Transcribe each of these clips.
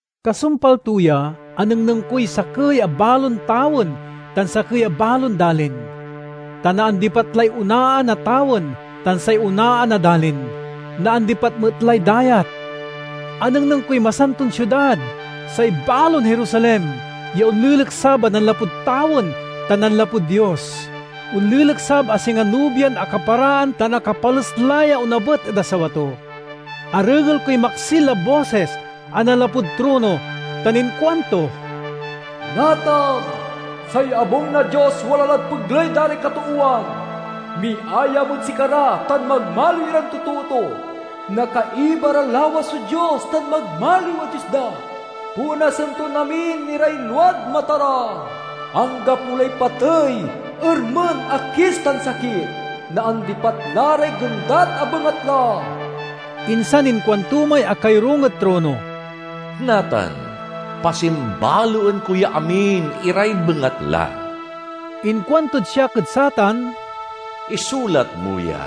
Kasumpal to ya, anengneng koy sakey a balon tawen tan sakey a balon dalin. Ta naandipat lay onaan a tawen tan say onaan a dalin; naandipat met lay dayat. Anengneng koy Masanton Siudad, say balon Jerusalem, ya onleleksab a nanlapud tawen tan nanlapud Dios. Onleleksab a singa nobian akaparaan ta akapales la ya onabet ed asawa to. Arengel koy maksil a bosis a nanlapud trono tan inkuanto, "Natan, say abung na Dios wala lad pegley da ray katoowan! Miayam ed sikara, tan magmaliw iran totoo to. Nakaiba ra lawas so Dios, tan magmaliw a Dios da. Ponasen ton amin iray luad mata ra. Anggapo lay patey, ermen, akis, tan sakit; naandipat la ray gendat a bengatla." Insan inkuanto may akayorung ed trono, "Natan, pasimbaloen ko ya amin iray bengatla!" Inkuantod siak ed satan, "Isulat mo ya,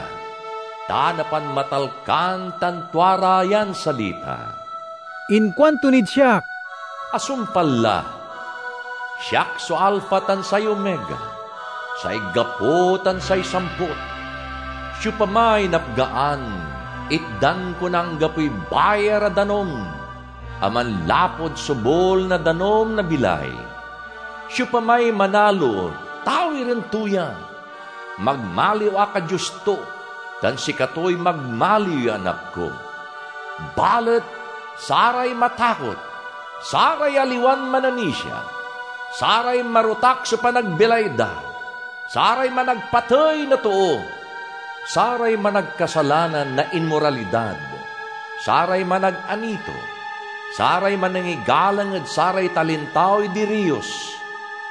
ta napanmatalkan tan tua ra yan salita." Inkuanto nid siak, "Asumpal la! Siak so Alpha tan say Omega, say gapo tan say samput. Siopamay napgaan itdan ko na anggapoy bayar a danum a manlapud sobul na danum na bilay. Siopamay manalo tawiren to ya: magmaliw ak a Dios to, tan sikatoy magmaliw ya anak ko. Balet saray matakot, saray aliwan mananisia, saray marotak so panagbilay da, saray managpatey na too, saray managkasalanan na inmoralidad, saray managanito, saray manangigalang ed saray talintaoy diriyos,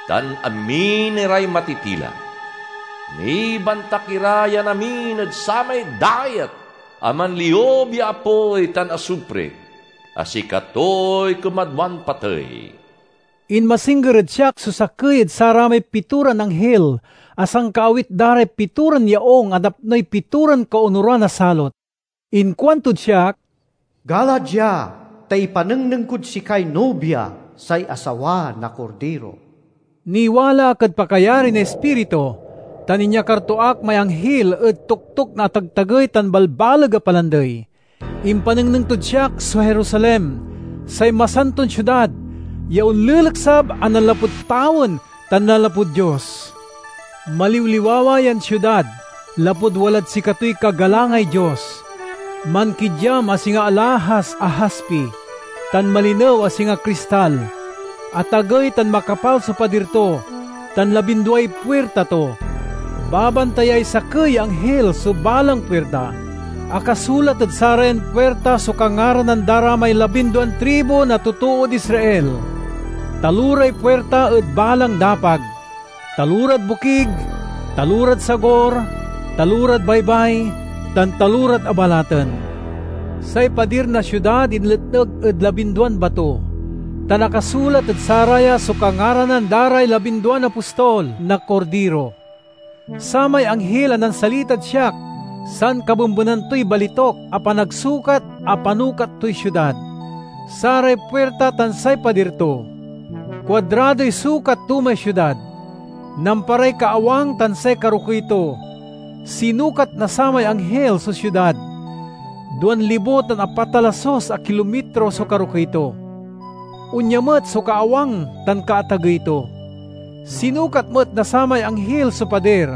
tan amin iray matitila—nibantak ira yan amin ed samay dayat a manliub ya apoy tan asupri, a sikatoy kumadwan patey." Inmasingger ed siak so sakey ed saramay pitoran anghil a sankaawit da ray pitoran yaung a napnoy pitoran kaonuran a salot. Inkuantod siak, "Gala dia, ta ipanengneng kod sikay Nobia, say asawa na Kordiro." Niwala ak ed pakayari na Ispiritu, tan inyakar to ak may anghil ed toktok na atagtagey tan balbaleg a palandey. Impanengneng tod siak so Jerusalem, say Masanton Siudad, ya onleleksab a nanlapud tawen tan nanlapud Dios. Maliwliwawa yan siudad lapud walad sikatoy kagalangay Dios; mankidyam a singa alahas a haspi, tan malinew a singa kristal. Atagey tan makapal so padir to, tan labinduay puirta to. Babantayay sakey ya anghil so balang puirta. Akasulat ed sarayan puirta so kangaranan da ray labinduan tribu na totood Israel. Taloray puirta ed balang dapag: talorad bokig, talorad sagur, talorad baybay, tan talorad abalaten. Say padir na siudad inletneg ed labinduan bato, tan akasulat ed saraya so kangaranan da ray labinduan apostol na Kordiro. Samay anghil a nansalitad siak sankabembenan toy balituk a panagsukat a panukat toy siudad, saray puirta tan say padir to. Kuadradoy sukat to may siudad: namparay kaawang tan say karokey to. Sinukat na samay anghil so siudad: duan libo tan apat a lasus a kilomitro so karokey to; onya met so kaawang tan kaatagey to. Sinukat met na samay anghil so padir: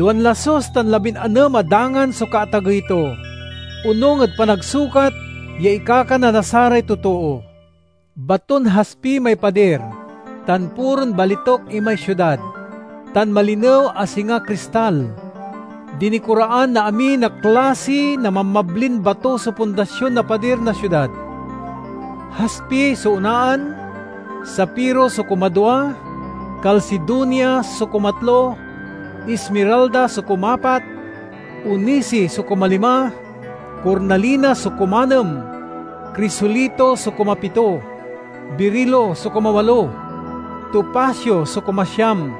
duan lasus tan labinanem a dangan so kaatagey to, onung ed panagsukat ya ikakana na saray totoo. Baton haspi may padir, tan puron balituk imay siudad, tan malinew a singa kristal. Dinikoraan na amin a klasi na mabmablin bato so pundasion na padir na siudad. Haspi so onaan, sapiro so kumadwa, kalsidonia so kumatlo, ismiralda so kumapat, onisi so kumalima, kornalina so kumanem, krisolito so kumapito, birilo so kumawalo, topasio so kumasiam,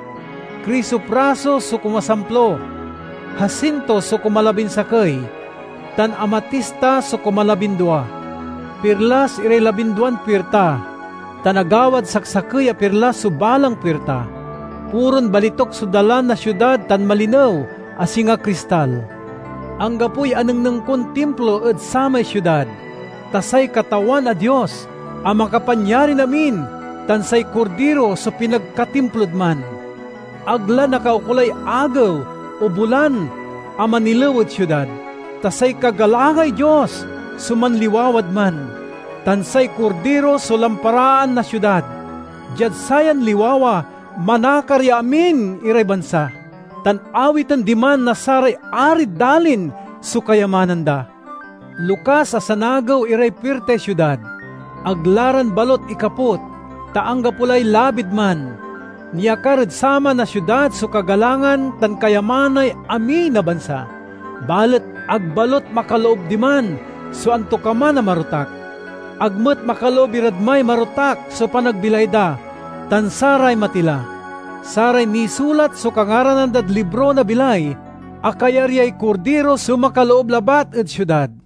krisopraso so kumasamplo, hasinto so kumalabinsakey, tan amatista so kumalabindua. Pirlas iray labinduan puirta, tan agawad saksakey a pirlas so balang puirta. Puron balituk so dalan na siudad tan malinew a singa kristal. Anggapoy anengneng kon timplo ed samay siudad, ta say Katawan a Dios a Makapanyarin-amin tan say Kordiro so pinagkatimplod man. Ag la nakaukolay agew o bulan a manilew ed siudad, ta say kagalangay Dios so manliwawad man, tan say Kordiro so lamparaan na siudad. Diad sayan liwawa manakar ya amin iray bansa, tan awiten diman na saray arid dalin so kayamanan da. Lokas a sanagew iray puirtay siudad. Ag la ran balut ikaput, ta anggapo lay labid man. Niakar ed saman a siudad so kagalangan tan kayamanay amin a bansa. Balet ag balut makaloob diman so antokaman a marotak. Ag met makaloob irad may marotak so panagbilay da tan saray matila. Saray nisulat so kangaranan dad libro na bilay a kayaryay Kordiro so makaloob labat ed siudad.